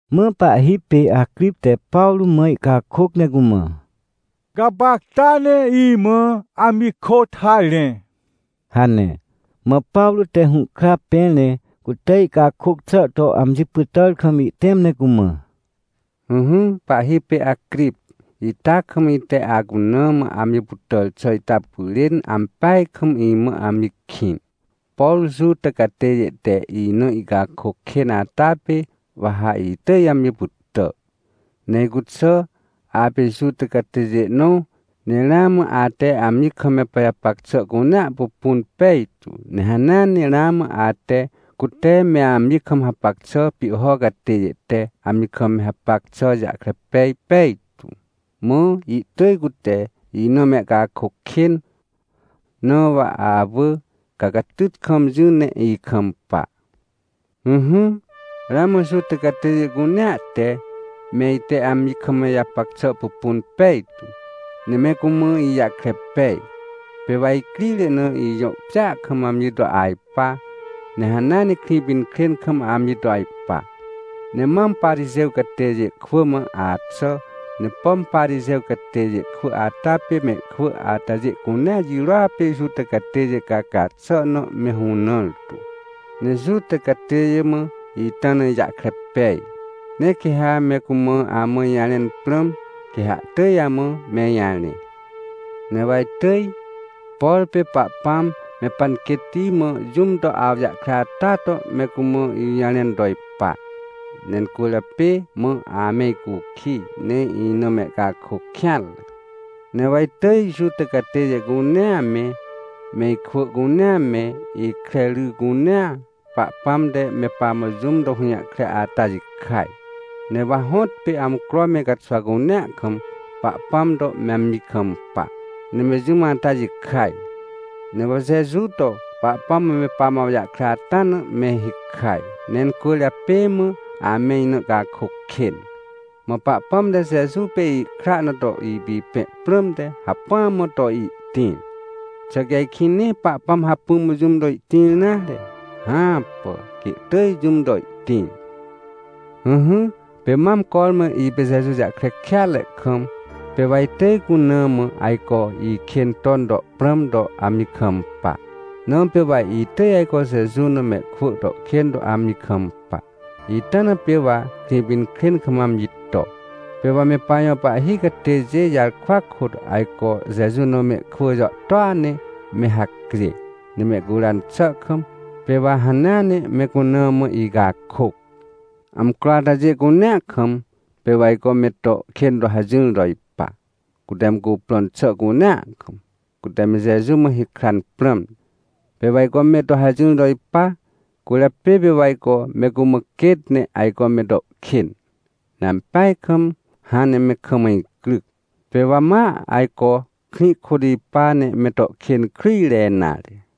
Mã pahhi pê Acrip te Pawrô mã ihcakôc ne cumã: — Gapacta ne imã amji kôt harẽ — hane. Mã Pawrô te hũhkra pẽr ne cute ihcakôc xà to amji pytàr kam ihtẽm ne cumã: — Ỹhỹ pahhi pê Acrip, ita kam ite acuna mã amji pytàr xà ita pyrên ampeaj kam imã amji kĩn. Por Juta catêjê te ina ihcakôc kên ata pê, wa ha itỳj amji pytà. Ne icuxà apê Juta catêjê nõ, ne ramã ate amji kam me pajapac xà cunea pupun pejtu, ne hanea ne ramã ate, cute me amji kam hapac xà pihho catêjê te amji kam me hapac xà jahkre pej pejtu. Mã ihtỳj cute ina mehcakôc kên. Na wa awỳ, ca catyt kam jỹ ne ikampa. — Ỹhỹ, ramã Juta catêjê cunea te, me ite amji kam ijapac xà pupun pejtu. Ne me cumã ijahkre pej, pê wa icrire na ijõ pjêa kam amji to ajpa, ne hanea ne Krĩpinkrên kam amji to ajpa. Ne mam Parixêw catêjê kwỳ mã axà. Ne pom Parixêw catêjê kwỳ ata pê mehkwỳ atajê cunea jirôa pê Juta catêjê caca xà na me hũnãr tu. Ne Juta catêjê mã ita na ijahkre pej, ne quê ha me cumã amã ijarẽn prãm, quê ha ihtỳj amã me ijarẽ. Ne wa itỳj, por pê Pahpãm me panquêtti mã jũm to awjahkre ata to me cumã ijũjarẽn to ipa, ne incwỳrjapê mã ame icukij, ne ina mehcakôc kêanre. Ne wa itỳj Juta catêjê cunea me, me ikwỳ cunea me, ikre ry cunea, Pahpãm te me pamã jũm to hũjahkre ata jikaj. Ne wa hõtpê, amcro me caxwa cunea kam, Pahpãm to me amji kampa, ne me jũm ata jikaj. Ne wa Jeju to Pahpãm me pamã awjahkre ata na me hikaj, ne incwỳrjapê mã ame ina ihcakôc kên. Mã Pahpãm te Jeju pê ihkra na to ipipẽ prãmte, hacpỹa mã to ihtĩr. Xà quê ajkĩ nee Pahpãm hacpỹ mã jũm to ihtĩr nare? Hãpà, quê ihtỳj jũm to ihtĩr. — Ỹhỹ, pê mam cormã ipê Jeju jahkre kêatre kam, pê wa itỳj cuna mã ajco ikên ton to prãm to amji kampa. Na pê wa itỳj ajco Jeju na mehkwỳ to kên to amji kampa. Ita na pê wa Krĩpinkrên kam amji to. Pê wa me pajõ pahhi catêjê jarkwa kôt ajco Jeju na mehkwỳ jàhtôa ne me hacjê. Ne mehcuran xà kam, pê wa hanea ne me cuna mã icakôc. Amcro atajê cunea kam pê wa ajco me to kên to hajỹr to ipa. Cute me cuprõn xà cunea kam, cute me Jeju mã hikran prãmte, pê wa ajco me to hajỹr to ipa. Cwỳrjapê pê wa ajco me cumã quêt, ne ajco me to kên. Ne ampeaj kam hãn me kam icryc, pê wa ma ajco krĩ kôt ipa, ne me to kên kryjre nare.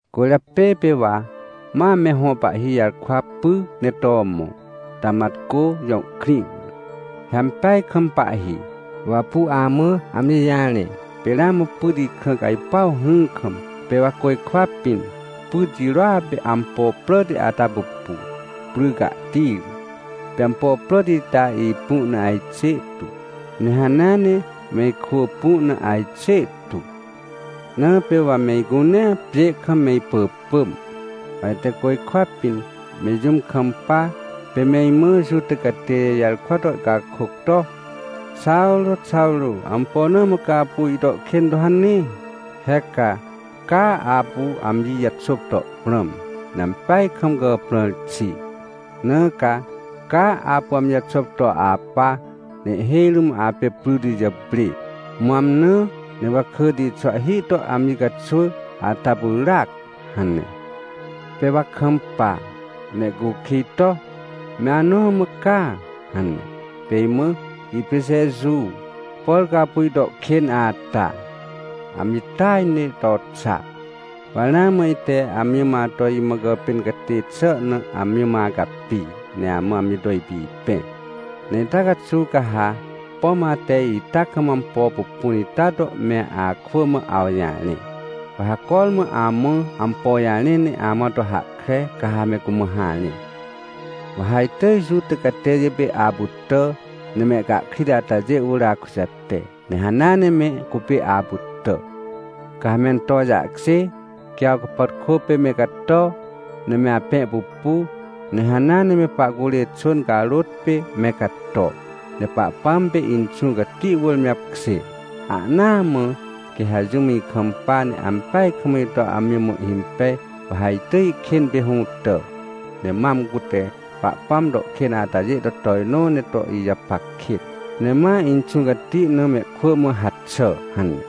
— Cwỳrjapê pê wa ma me hõ pahhi jarkwa py ne to mõ, Tamatcô jõ krĩ wỳr. He ampeaj kam pahhi, wa apu amã amji jarẽ, pê ramã pyt ikrã cajpuw hỹr kam, pê wa côjkwa pĩn, pyt jirôa pê ampo pràti ata pupu, pry cahti ri. Pê ampo pràti ita ipu na ajxê tu, ne hanea ne me ikwỳ pu na ajxê tu. Na pê wa me icunea pjê kam me ipỳpỳm, wa ite côjkwa pĩn me jũm kampa, pê me imã Juta catêjê jarkwa to ihcakôc to: “Xawrô, Xawrô, ampo na mã ca apu ito kên to hane? He ca, caa apu amji jaxôp to prãm, ne ampeaj kam gàprãr xi. Na ca, caa apu amji jaxôp to apa. Ne ihhêj rũm apê pryti jàprê, mã amnã, ne wakỳti xwahhi to amji caxwỳ ata pyràac” hane. — Pê wa kampa, ne ihcukij to: “Me anõ mã ca?” hane. Pê imã: “Ipê Jeju, por ca apu ito kên ata. Amji tỳaj ne to xa. Wa ramã ite amji mã ato imã gàpên catê xà na, amji mã acapi, ne amã amji to ipipẽ. Ne ita caxuw ca ha, pom ate ita kam ampo pupun ita to me akwỳ mã awjarẽ, wa ha cormã amã ampo jarẽ ne amã to hahkre, ca ha me cumã harẽ. Wa ha itỳj Juta catêjê pê apytà, ne mehcahkrit atajê wỳr akujate, ne hanea ne me cupê apytà. Ca ha mento jahkjê, quê awcapàtkô pê me cato, ne me apẽ pupu, ne hanea ne me pahcurê xwỳn carôt pê me cato, ne Pahpãm pê Inxũ Cati wỳr me apkjê. Ahnaa mã quê ha jũm ikampa, ne ampeaj kam ito amji mã ihhimpej, wa ha itỳj ihkên pê hũtà, ne mam cute Pahpãm to kên atajê to tojnõ ne to ijapac kêt, ne ma Inxũ Cati na mehkwỳ mã haxà” hane.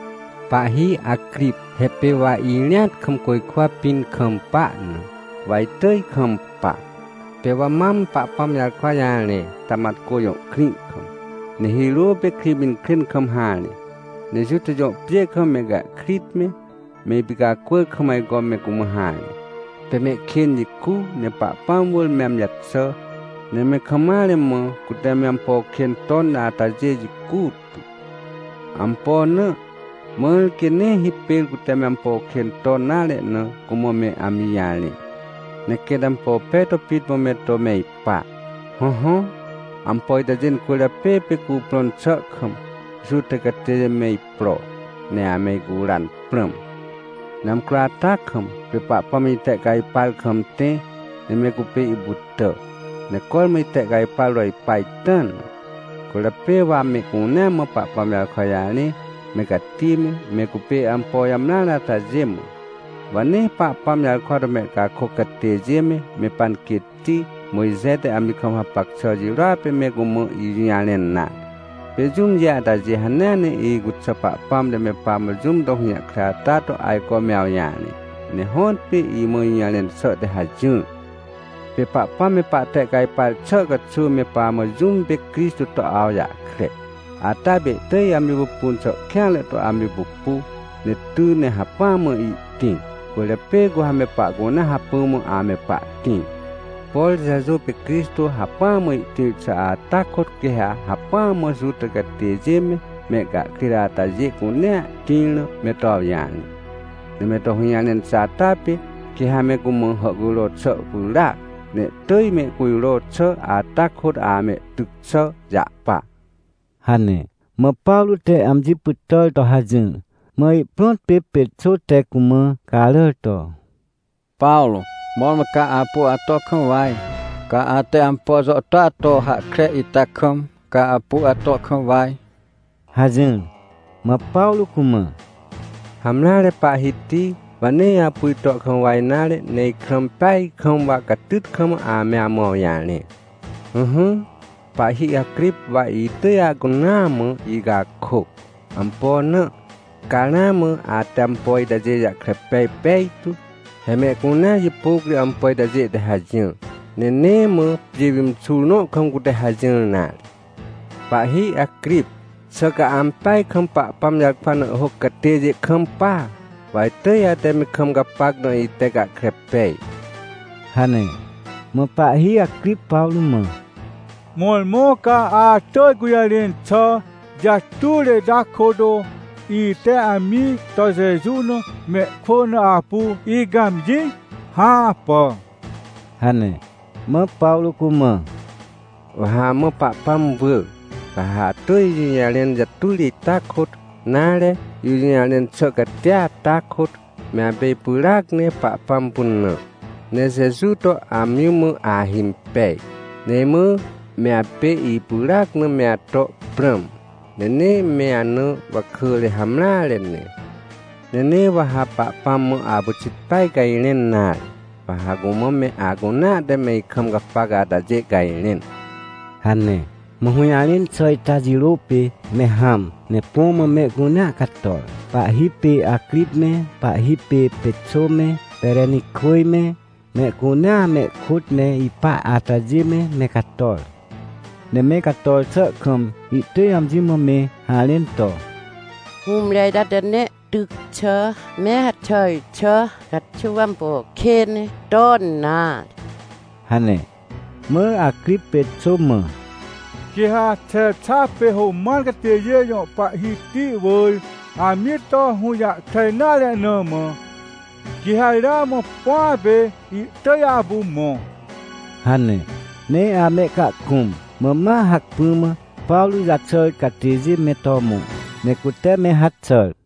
— Pahhi Acrip, he pê wa irĩat kam côjkwa pĩn kampa na, wa itỳj kampa. Pê wa mam Pahpãm jarkwa jarẽ Tamatcô jõ krĩ kam, ne hirô pê Krĩpinkrên kam harẽ. Ne Juta jõ pjê kam, mehcahkrit me, me ipicacwỳr kam ajco me cumã harẽ, pê mehkên jicu, ne Pahpãm wỳr me amji jaxà, ne me kam mare mã cute me ampo kên ton atajê jicu tu. Ampo na? Mãr quê nee hipêr cute me ampo kên ton nare na cumã me amji jarẽ, ne quêt ampo pej to pit mã me to me ipa. — Hõhõ, ampo itajê cwỳrjapê pê cuprõn xà kam, Juta catêjê me ipro, ne ame icuran prãm. Ne amcro ata kam, pê Pahpãm itehcajpar kam tẽ, ne me cupê ipytà, ne cormã itehcajpar to ipa ita na. Cwỳrjapê wa mehcunea mã Pahpãm jarkwa jarẽ, me cati me, me cupê ampo jamreare atajê mã. Wa nee Pahpãm jarkwa to mehcakôc catêjê me, me panquêtti Mojxe te amji kam hapac xà jirôa pê me cumã ijũjarẽn nare. Pê jũmjê atajê hanea ne icuxà Pahpãm te me pamã jũm to hũjahkre ata to ajco me awjarẽ. Ne hõtpê imã ijũjarẽn xà te hajỹr. Pê Pahpãm me pahtehcajpar xà caxuw me pamã jũm pê Crixtô to awjahkre, ata pê ihtỳj amji pupun xà kêanre to amji pupu, ne ty ne hacpỹa mã ihtĩr. Cwỳrjapê cu ha me pahcunea hacpỹa mã ame pahtĩr. Por Jeju pê Crixtô hacpỹa mã ihtĩr xà ata kôt, quê ha hacpỹa mã Juta catêjê me, mehcahkrit atajê cunea tĩr na me to awjarẽ. Ne me to hũjarẽn xà ata pê, quê ha me cumã hàhcujro xà pyràac, ne ihtỳj mehcujro xà ata kôt amehtyc xà jahpa — hane. Mã Pawrô te amji pytàr to hajỹr, mã ihprõt pê Pexô te cumã caràr to: — Pawrô, mõrmõ ca apu ato kam waj! Ca ate ampo jàhtôa to hahkre ita kam, ca apu ato kam waj! — hajỹr. Mã Pawrô cumã: — Hamreare, pahhiti, wa nee apu ito kam waj nare, ne ikrã impeaj kam wa catyt kam ame amã awjarẽ. Ỹhỹ, pahhi Acrip wa itỳj acunaa mã icakôc. Ampo na? Ca ramã ate ampo itajê jahkre pej pejtu. He mehcunea jipôc ri ampo itajê te hajỹr, ne nee mã pjê pimxur nõ kam cute hajỹr nare. Pahhi Acrip, xà ca ampeaj kam Pahpãm jarkwa na ihhôc catêjê kampa? Wa itỳj ate me kam gapac na ite gahkre pej — hane. Mã pahhi Acrip Pawrô mã: — Mõrmõ ca atỳj gũjarẽn xà jatujre ita kôt ite amji to Jeju na mehkwỳ na apu icãmjĩ? Hãpà! — hane. Mã Pawrô cumã: — Wa ha amã Pahpãm wỳ, ca ha atỳj ijũjarẽn jatujre ita kôt, nare, ijũjarẽn xà cati ata kôt, me apê ipyràac ne Pahpãm pynã, ne Jeju to amji mã ahimpej. Ne imã me apê ipyràac na me ato prãm, ne nee me ana wakỳre hamreare ne. Ne nee wa ha Pahpãm mã apyxit peaj cajrẽn nare, wa ha cumã me acunea te me ikam gapac atajê cajrẽn — hane. Mã hũjarẽn xà ita jirô pê, me hãm, ne põ mã mehcunea cator. Pahhi pê Acrip me, pahhi pê Pexô me, Perenikwỳj me, mehcunea mehkôt me ipa atajê me, me cator. Ne me cator xà kam ihtỳj amji mã me harẽn to: — Hũmre ita te nee ihtyc xà me haxàr xà caxuw ampo kên ton nare — hane. Mã Acrip Pexô mã: — Quê ha Xexa pê Roman catêjê jõ pahhiti wỳr amji to hũjahkre nare na mã, quê ha ramã põa pê ihtỳj apu mõ — hane. Ne amehcahkũm, mã ma hacpỹ mã Pawrô jaxàr catêjê me to mõ, ne cute me haxàr.